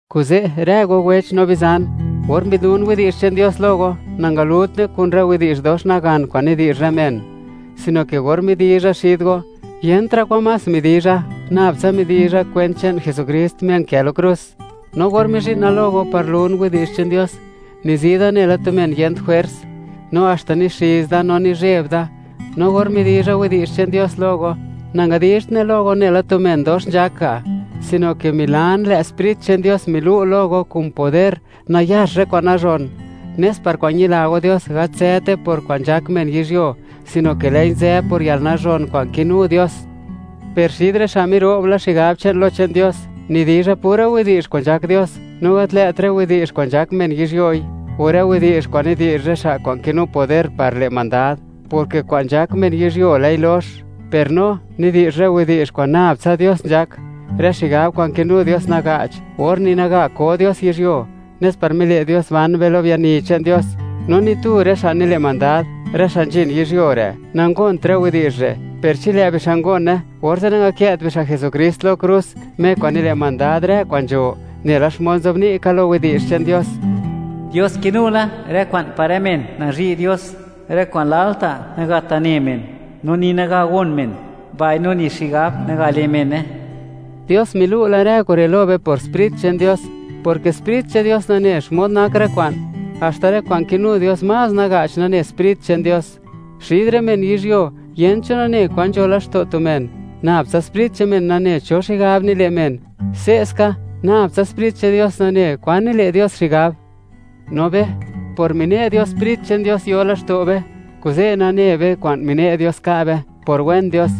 Kuze', rë go wech no bizan, or mbi'dlun widi'zh che'n Dios lo go, nangalutne kun rë widi'zh dox nagan kwa'n nidi'zh rë men, sino ke or midizha xid go, yentra' kwan más midizha, nab tsa midizha kwent che'n Jesukrist, Me nkë lo krus. No or mizhi'na lo go par lun widi'zh che'n Dios, nizi da nela tu men yent jwers, no haxta nixiz da no nizheb da. No or midizha widi'zh che'n Dios lo go, nangadizhtne lo go nela tu men dox nzhak ga', sino ke milan, lë' Sprit che'n Dios milu' lo go kun poder, nayax rë kwa'n nazhon, nes par kwa'n ñila go Dios, gat nzëte por kwa'n nzhak men yizhyuo, sino ke lë'i nzë por yalnazhon kwa'n kinu Dios. Per xid rë xa' miro'b la xigab che'n, lo che'n Dios, nidizha pura widi'zh kwa'n nzhak Dios, no gat lë't rë widi'zh kwa'n nzhak men yizhyoi, o rë widi'zh kwa'n nidi'zh rë xa' kwa'n kinu poder par le' mandad, porke kwa'n nzhak men yizhyuo, lë'i lox. Per no, nidi'zh rë widi'zh kwa'n nab tsa Dios nzhak, rë xigab kwa'n kinu Dios naga'ch, or ni naga ko Dios yizhyuo, nes par mile' Dios ban be lo biani che'n Dios. No ni tu rë xa' nile' mandad, rë xa' nzhin yizhyuo re', nangont rë widi'zh re'; per chi lë' bixa' ngone, orze' nangakë't bixa' Jesukrist lo krus, Me kwa'n nile' mandad rë kwa'n nzho. Nela xmod nzobni' ka lo Yech che'n Dios: Dios kinu la rë kwa'n par rë men nazhi' Dios, rë kwa'n lalta' nagat ne men, no ni naga gon men, mbaino ni xigab naga le' mene. Dios milu' la rë kure' lo be por Sprit che'n Dios, porke Sprit che'n Dios nane xmod nak rë kwa'n, haxta rë kwa'n kinu Dios más naga'ch, nane Sprit che'n Dios. Xid rë men yizhyuo, yent cho nane kwan nzho laxto' tu men, nab tsa sprit che'n men nane cho xigab nile' men. Se'ska, nab tsa Sprit che'n Dios nane, kwan nile' Dios xigab. No be, por mine' Dios Sprit che'n Dios yo laxto' be, kuze' nane be kwan mine' Dios ka' be, por wen Dios.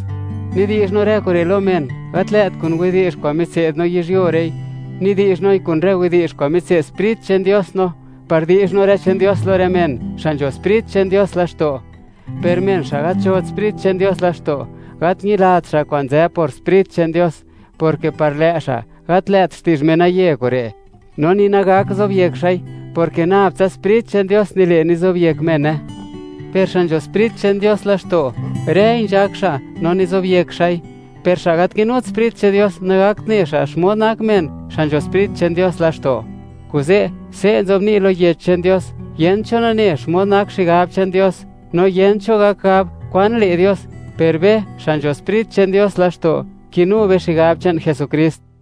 Nidi'zh no rë kure' lo men, gat lë't kun widi'zh kwa'n mitse'd no yizhyuo re'i; nidi'zh noi kun rë widi'zh kwa'n mitse'd Sprit che'n Dios no, par di'zh no rë che'n Dios lo rë men xa' nzho Sprit che'n Dios laxto'. Per men xa' gat nzhot Sprit che'n Dios laxto', gat ñilat xa' kwa'n nzë por Sprit che'n Dios, porke par lë' xa', gat lë't xti'zh menaye kure', no ni nagak zobyek xa'i, porke nab tsa Sprit che'n Dios nile' nizobyek mene. Per xa' nzho Sprit che'n Dios laxto', rëi nzhak xa' no nizobyek xa'i; per xa' gat kinut Sprit che'n Dios, nagakt ne xa' xmod nak men xa' nzho Sprit che'n Dios laxto'. Kuze', se' nzobni' lo Yech che'n Dios: Yent cho nane xmod nak xigab che'n Dios, no yent cho gak gab kwan le' Dios. Per be, xa' nzho Sprit che'n Dios laxto', kinu be xigab che'n Jesukrist.